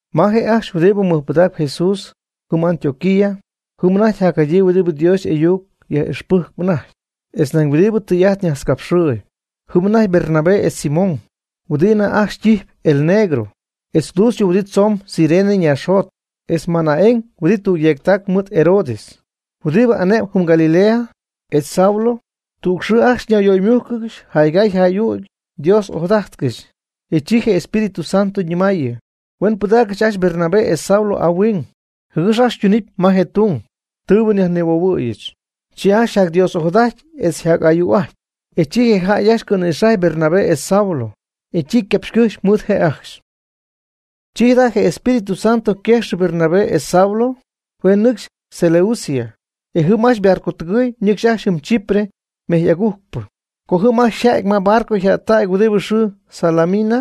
Ma je' ajcxy huɨdi mɨjpɨdacp Jesús jɨm Antioquía, jɨm anajty jadyii huɨdi Dios y'ayuc yaj'ixpɨjcp anajty, etz nañ huɨdibɨ tɨy'ajt najtzcapxɨɨyb. Jɨm anajty Bernabé etz Simón, huɨdi anajty ajcxy ytijpy el Negro, etz Lucio huɨdi tzoon Cirene ñaaxjot, etz Manaén huɨdi tüg yeectac mɨɨd Herodes, huɨdibɨ ane'm jɨm Galilea, etz Saulo. Tüg xɨɨ ajcxy ñayyöymújcɨgɨxy jaygay jay'ügy Dios ojadajtcɨxy. E chi je Espíritu Santo ñɨmaayɨ: ―Huen pɨdáacɨgɨch ajcxy Bernabé etz Saulo ahuing jɨgɨx ajcxy ytunɨpy ma je tung tɨɨbɨ nyajnihuohuɨ̈yɨch. Chi ajcxy yjacDios'ojadajty etz yjac'ayuu'ajty, e chi je jäy ajcxy cɨ̈nïxajy Bernabé etz Saulo, e chi ycapxycɨjxy mɨɨd je' ajcxy. Chi jada' je Espíritu Santo yquejxɨ Bernabé etz Saulo huen nɨcxy Seleucia, e jɨm ajcxy ybarcotɨgɨɨy nɨcxy ajcxy jɨm Chipre mejy agujcpɨ. Co jɨm ajcxy yja'ty ma barco yjättac huɨdi yxɨɨ Salamina,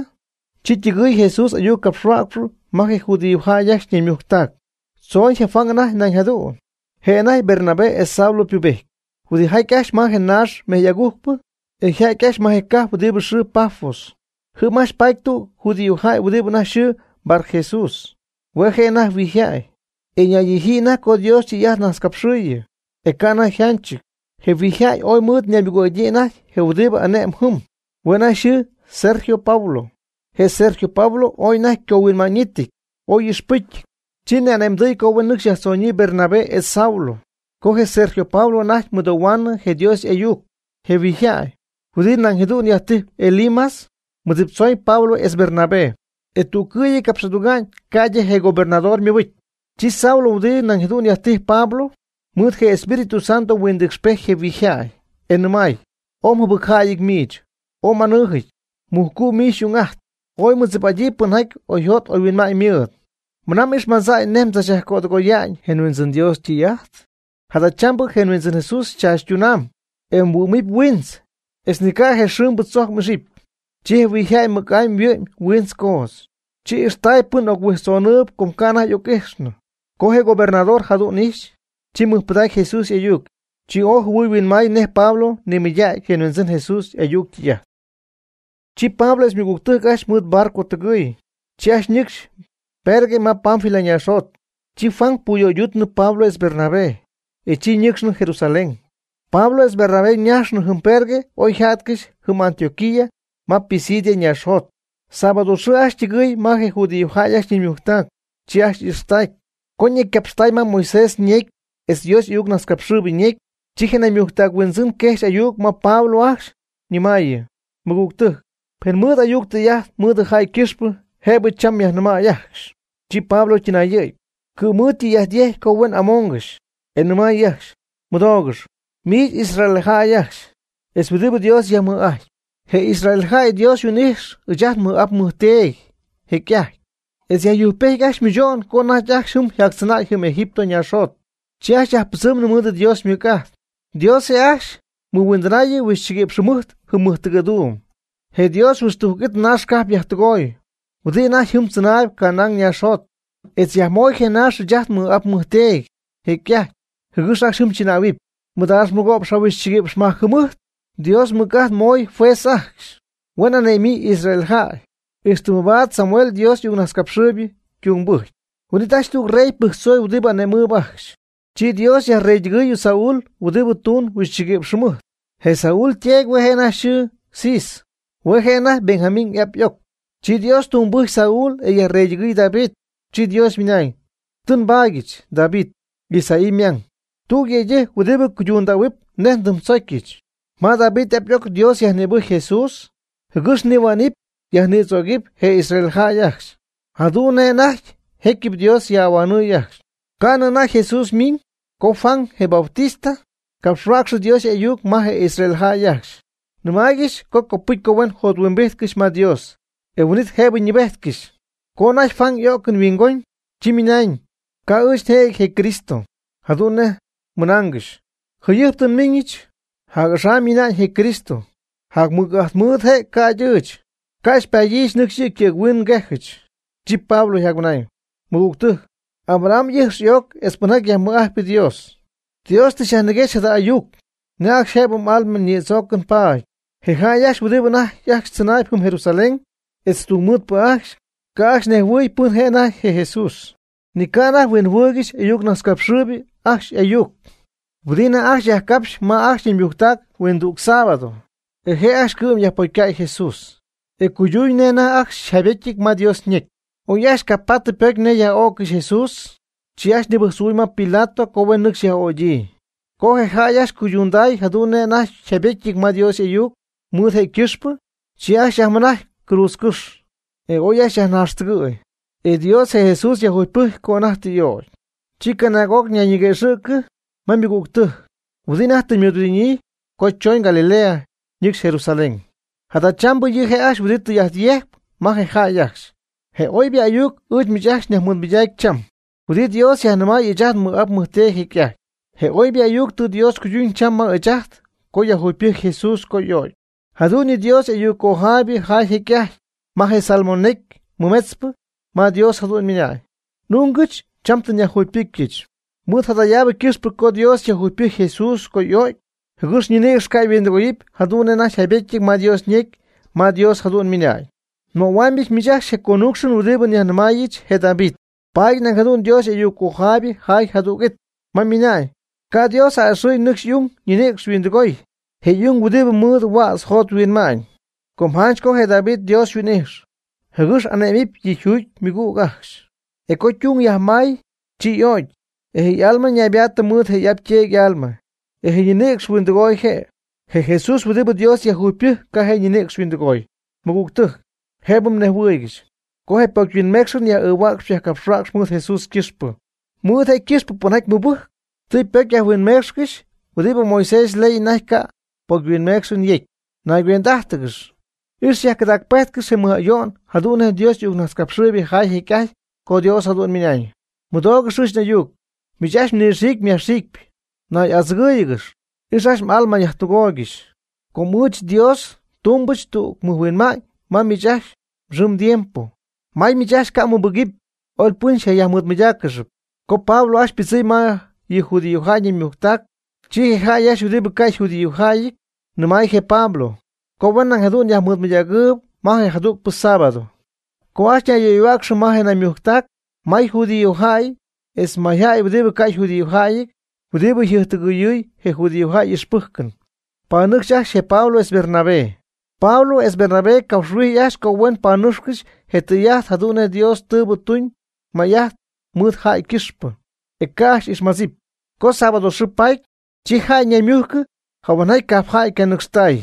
chi ytɨgɨɨy Jesús y'ayuccapxhuäcxp ma je judíojäy ajcxy naymujctac. Tzooñ je Juan anajty nañ jadu'n je' anajty Bernabé etz Saulo pubéjtɨp. Huɨdijttay ajcxy ma je naax mejy'agujcpɨ, e yja'ty ajcxy ma je cajp huɨdi yxɨɨ Pafos. Jɨm ajcxy paty tüg judíojäy huɨdi anajty yxɨɨ Barjesús, hue' je' anajty huijyjäy, e ñaydijyii anajty co Dios ytɨy'ajt najtzcapxɨɨyɨ, e ca' anajty yjanchɨty. Je huijyjäy ooy mɨɨd ñaymɨgüg'adyii anajty je huɨdibɨ ane'm jɨm, hue' anajty yxɨɨ Sergio Paulo. Je Sergio Paulo ooy anajty ycohuinma'ñɨty, ooy y'ixpɨ́cyɨty. Chi ni'ane'mdɨy co huen nɨcxy yajtzonyii Bernabé etz Saulo. Com je Sergio Paulo anajty mɨdoohuaanɨ je Dios y'ayuc. Je huijyjäy, huɨdi nañ jadu'n yajtijp Elimas, mɨdziptzoñ Pablo etz Bernabé, e tüccɨ'y capx'aduga'ñ ca'ydɨ je gobernador ymɨbɨcy. Chi Saulo, huɨdibɨ nañ jadu'n yajtijpy Pablo, mɨɨd je Espíritu Santo huindɨɨcxpejty je huijy jäy, e nɨmay: ―¡Ooy mjɨbɨcjäyɨty miich, ooy m'anɨɨjɨty, mujcu' miich xy'ung'ajtp, ooy mmɨdzip'aty pɨnjaty oyjot oyhuinma'ñ mɨɨd! ¿Mɨna m'ixmadza'ñ nej mdzachyajtɨgoya'ñ je Huindzɨn Dios ytɨy'ajt? Jadachambɨ je Huindzɨn Jesús xychachytunaamb, e mhuɨ́'mɨp huiintz, etz ni ca' je xɨɨmbɨ tzojc m'ixɨpy. Chi je huijyjäy mɨc'amy yhuɨ'my huiintz coodz, chi ixtay pɨn oc-huijtznɨcxɨɨb com ca' anajty y'oc'ijxnɨ. Co je gobernador jadu'n ijxy, chi mɨjpɨdacy Jesús y'ayuc, e chi ooy jɨhuɨɨy huinmaay nej Pablo nimɨydägy je Huindzɨn Jesús y'ayuc ytɨy'ajt. Chi Pablo etz ymɨgügtɨjc ajcxy mɨɨd ybarcotɨgɨɨy, chi ajcxy ñɨcxy Perge ma Panfilia ñaaxjot. Chi Juan puyöyduutnɨ Pablo etz Bernabé, e chi ñɨcxnɨ Jerusalén. Pablo etz Bernabé ñajxy jɨm Perge oyja'tcɨxy jɨm Antioquía ma Pisidia naaxjot. Sábado xɨɨ ajcxy ytɨgɨɨy ma je judíojäy ajcxy ñaymujctac, chi ajcxy ixtactay. Co ñecycapxtay ma Moisés ñecy etz Dios y'ayucnajtzcapxɨɨybɨ ñecy, chi je naymujctac huindzɨn quejxy ayuc ma Pablo ajcxy, ñɨmaayɨ: ―Mɨgügtɨjc, pen mmɨɨd ayuc tɨy'ajt mɨɨd jäy ycɨxpɨ jëbɨ cham myajnɨmäy ajcxy. Chi Pablo ytɨnayɨ̈gy, ycɨ' mɨɨd ytɨy'ajt yecy co huen amoongɨxy, e nɨmay ajcxy: ―Mɨdoogɨx, miich Israel jäy ajcxy, etz huɨdibɨ Dios yajmɨj'ajtp. Je Israel jäy Dios huin'ijxy ɨɨch'ajt nmɨj'ap nmɨjteedy jecy'ajty etz yajyujcpejt ajcxy mɨcho'n co anajty ajcxy jɨm yjactzɨnäy Egipto ñaaxjot. Chi ajcxy yajpɨdzɨɨmnɨ mɨɨd Dios ymɨc'ajt. Dios je' ajcxy mɨhuindɨnay huixchɨguïpx jɨmɨjt jɨm mɨjtɨgɨ̈duum. Je Dios huixtujc it naax cajp yajtɨgoy huɨdi anajty jɨm tzɨnaayb Canaán ñaaxjot, etz yajmoy je naax ɨɨch ajt nmɨj'ap nmɨjteedy jecy'ajty jɨgɨx ajcxy jɨm chɨnähuɨpy. Mɨdaax mɨgo'px jahuixchɨgïpx majc jɨmɨjt Dios mɨc'ajt mooy juez ajcxy huen ane'myii Israel jäy ixtɨ mabaad Samuel je Dios y'ayucnajtzcapxɨɨyb ytungbɨjcy. Huin'it ajcxy tüg rey pɨjctzoy huɨdi ane'mɨɨb ajcxy. Chi Dios yajreytɨgɨɨy Saul huɨdi tuun huixchɨgïpx jɨmɨjt. Je Saul yteedy hue' je' anajty yxɨɨ Cis, hue' je' anajty Benjamín y'ap y'oc. Chi Dios tungbɨjcy Saul e yajreytɨgɨɨy David, chi Dios ymɨnañ: “Tɨ nbaadyɨch David, Isaí ymang, tüg yëydɨjc huɨdibɨ cuydundähuɨpy nej ndɨmdzocyɨch.” Ma David y'ap y'oc Dios yajnïbɨjcy Jesús, jɨgɨx nihuänɨpy yajnïdzögɨpy je Israel jäy ajcxy, jadu'n nej anajty jécyɨp Dios yaj'ahuanɨɨy ajcxy. Ca'nɨ anajty Jesús miiñ co Juan, je Bautista, capxhuäcxy Dios y'ayuc ma je Israel jäy ajcxy, nɨmaaygɨxy co copɨcy huen jothuimbijtcɨxy ma Dios, e huin'it jëbɨ ñɨɨbéjtcɨxɨpy. Co anajty Juan y'o'cɨn huingon, chi ymɨnañ: “Ca' ɨɨch njëjɨty je Cristo, jadu'n nej mmɨnaangɨxy. Jayɨjp tɨ nmiiñɨch, jac'axam miina'ñ je Cristo; jacmɨc'ajt mɨɨd je' ca'ydɨ ɨɨch. Ca' xypaadyɨch nɨcxy yɨ' ycɨ̈ghuin nguejɨch.” Chi Pablo yjacmɨnañ: ―Mɨgügtɨ́jc, Abraham y'ɨjx y'oc etz pɨnjaty yajmɨj'ajtp Dios, Dios tɨ xyajniguexy jada ayuc nej ajcxy jëbɨ m'alma nïdzoocɨn paady. Je jäy ajcxy huɨdi anajty ajcxy tzɨnaayb jɨm Jerusalén etz tungmɨɨdpɨ ajcxy, ca' ajcxy nejhuɨy pɨn je' anajty je Jesús, ni ca' anajty huinjɨhuɨɨygɨxy y'ayucnajtzcapxɨɨybɨ ajcxy y'ayuc huɨdibɨ anajty yajcapxp ma ajcxy ñaymujctac huindüg sábado. E je' ajcxy cɨ'm yajpocycäy Jesús, e cuyduñ nej anajty ajcxy yjaybetyɨty ma Dios ñecy. Oy ajcxy ca' paty pocy nej yaj'öccɨxɨpy Jesús, chi ajcxy nibɨjctzohuɨɨy ma Pilato co huen nɨcxy yaj'ögyii. Co je jäy ajcxy cuydunday jadu'n nej anajty yjaybétyɨty ma Dios y'ayuc mɨɨd je' ycɨxpɨ, chi ajcxy yajmɨnajcy cruudzcɨ́xy, etz oy yajnaaxtɨgɨɨygɨxy. E Dios je Jesús yajjugypɨjc co anajty tɨ y'ögy. Chi canaag'oc ñayguëxɨ̈go'cɨ ma ymɨgügtɨjc huɨdi anajty tɨ ymɨɨdhuɨdidyii co chooñ Galilea ñɨcxy Jerusalén. Jadachambɨ yɨ' je' ajcxy huɨdi tɨy'ajt yejcpy ma je jäy ajcxy. Je oybɨ ayuc ɨɨch miich ajcxy nyajmɨɨdmɨydacpy cham, huɨdi Dios yajnɨmay ɨɨch'ajt nmɨj'ap nmɨjteedy jecy'ajty. Je oybɨ ayuc tɨ Dios cuyduñ cham ma ɨɨch ajt co yajjugypɨjcy Jesús co y'o'cy. Jadu'n yɨ Dios y'ayuccojaaybɨ jaay jecy'ajty ma je Salmo necy mɨmetzpɨ ma Dios jadu'n ymɨnañ: “N'ungɨch cham tɨ nyajjuugypɨcyɨch.” Mɨɨd jadayaabɨ ycɨxpɨ co Dios tɨ yajjugypɨcy Jesús co y'o'cy, jɨgɨx ñinïcx ca yhuindɨgooyɨpy jadu'n anajty jaybétyɨty ma Dios ñecy ma Dios jadu'n ymɨnañ: “Nmöhuaamyɨch miich ajcxy je conúcxɨn huɨdibɨ nyajnɨmaayɨch je David.” Paady nañ jadu'n Dios y'ayuccojaaybɨ jaay jadüg'it, ma ymɨna'ñ: “Ca' Dios a'ɨxɨ̈y nɨcxy y'ung ñinïcx yhuindɨgooy, je y'ung huɨdibɨ mɨɨd huädz jot huinma'ñ.” Com janch co je David Dios huin'ijxy, jɨgɨx ane'mɨpy yɨ' yjuugy ymɨgüg ajcxy. E co ytung yajmay, chi y'o'cy, e je' y'alma ñaybaattɨ mɨɨd je y'ap yteedy y'alma, e je' ñinïcx huindɨgooy je'. Je Jesús huɨdibɨ Dios yajjugypɨjc ca' je' ñinïcx yhuindɨgooy. Mɨgügtɨjc, jëbɨ mnejhuɨɨygɨxy, co je pocyhuinmeecxɨn yaj'ɨɨhuäcxy yajcapxhuäcxy mɨɨd Jesús ycɨxpɨ. Mɨɨd je' ycɨxpɨ pɨnjaty mɨbɨjcp tɨ ypocyyajhuinmeecxcɨxy huɨdibɨ Moisés yley anajty ca'p pocyhuinmeecxɨn yecy. Nayguend'ájtɨgɨx, ix xyajcɨdacpejtcɨx je mɨj ayo'n jadu'n nej Dios y'ayuccojaaybɨ jaay jecy'ajty co Dios jadu'n ymɨnañ: Mɨdoogɨx ɨɨch n'ayuc, miich ajcxy nɨxiicpɨ yajxiicpɨ, nay'adzɨgɨ́ɨyɨgɨxy, ix m'alma myajtɨgooygɨxy. Com ɨɨch Dios ndumybɨch tüg mɨjhuinma'ñ ma miich ajcxy mxɨɨ mdiempo. May miich ajcxy ca' mmɨbɨgɨpy, oy pɨn xyjayajmɨɨdmɨydáaccɨxɨpy. Co Pablo ajcxy ypɨdzɨmy ma yɨ judíojäy ñaymujctac, chi je jäy huɨdibɨ ca' yjudíojäyɨty nɨmay je Pablo co huen nañ jadu'n yajmɨɨdmɨydägɨɨyb ma je jadügpɨ sábado. Co ajcxy yöyhuäcxnɨ ma nayyöymujctac may judíojäy etz mayjäy huidi ca' yjudíojäyɨty huɨdibɨ jɨjptɨgɨyɨɨy je judíojäy y'ixpɨ́jcɨn, panɨcxy ajcxy je Pablo etz Bernabé. Pablo etz Bernabé capxhuijy ajcxy co huen panɨ́cxcɨxy je tɨy'ajt jadu'n nej Dios tɨɨbɨ tuñ may'ajt mɨɨd jäy ycɨxpɨ, e ca' ajcxy ixmadzɨpy. Co sábado yxɨɨ paty, chi jäy ñayyöymujcɨ jahuenjaty cajp jäy ycanɨcxtay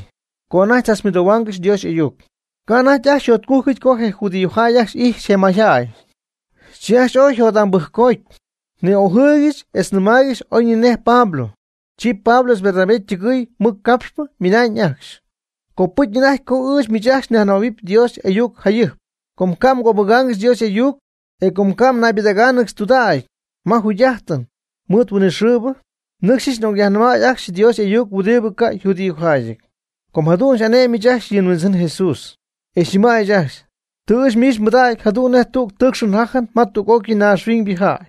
co anajty tzachmɨdoohuaangɨxy Dios y'ayuc. Ca' anajty ajcxy yjotcújcɨty co je judíojäy ajcxy ijxy je mayjäy. Chi ajcxy ooy yjot'ambɨjccoty ni'ojɨɨygɨxy etz nɨmaaygɨxy oy ni nej Pablo. Chi Pablo etz Bernabé ytɨgɨɨy mɨccapxpɨ ymɨnañ ajcxy: ―Copɨcy anajty co ɨɨch miich nyajnɨmähuɨpy Dios y'ayuc jayɨjp. Com ca' mgöbɨgaangɨxy Dios y'ayuc, e co ca' mnaybɨdáacɨgɨxy tudägy ma jugy'ájtɨn mɨɨd huinɨxɨɨbɨ, nɨcxyɨch n'ocyajnɨmäy ajcxy Dios y'ayuc huɨdibɨ ca' yjudíojäyɨty. Com jadu'n xy'ane'myɨch ajcxy yɨ Huindzɨn Jesús, e xyñɨmaayɨch ajcxy: Tɨ ɨɨch miich nbɨdägy jadu'n nej tüg tɨɨcxɨn jajɨn ma tüg'ócɨy naaxhuiñybɨ jäy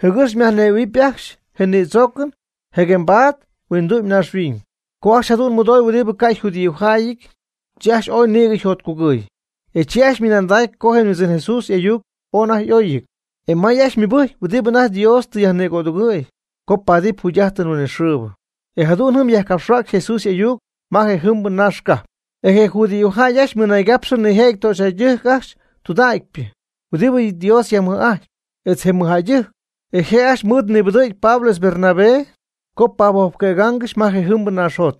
jɨgɨx myajnejhuɨ̈huɨpy ajcxy je nïdzoocɨn jɨguembaad huindu'my naaxhuiñ. Co ajcxy jadu'n mɨdoy huɨdibɨ ca' yjudíojäyɨty, chi ajcxy ooy nïgɨ yjotcugɨɨy, e chi ajcxy ymɨnandacy co je Huindzɨn Jesús y'ayuc ooy anajty y'óyɨty. E may ajcxy mɨbɨjcy huɨdibɨ anajty Dios tɨ yajnigödungɨ̈y co paatɨp jugy'ájtɨn huinɨxɨɨbɨ. E jadu'n jɨm yajcapxhuäcxy Jesús y'ayuc ma je jɨmbɨ naax cajp. E je judíojäy ajcxy mɨnaygapxɨ nijëjɨty töxyjäydɨjc ajcxy tudägypɨ huɨdibɨ Dios yajmɨj'ajtp, etz je mɨjjäydɨjc, e je' ajcxy mɨɨd mɨbɨdɨ̈gy Pablo etz Bernabé co pahuojpquëgaangɨxy ma jejɨmbɨ naaxjot.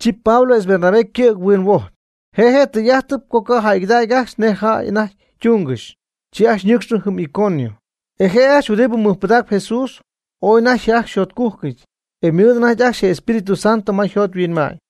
Chi Pablo etz Bernabé ycɨ̈g huinhuojpy, je' je' tɨy'ajtɨp co ca' jäygɨdacy ajcxy nej jäy anajty ytungɨxy. Chi ajcxy ñɨcxnɨ jɨm Iconio. E je' ajcxy huɨdibɨ mɨjpɨdaacp Jesús ooy anajty ajcxy yjotcujcɨty. E ymɨɨd anajty ajcxy je Espíritu Santo ma yjot yhuinma'ñ.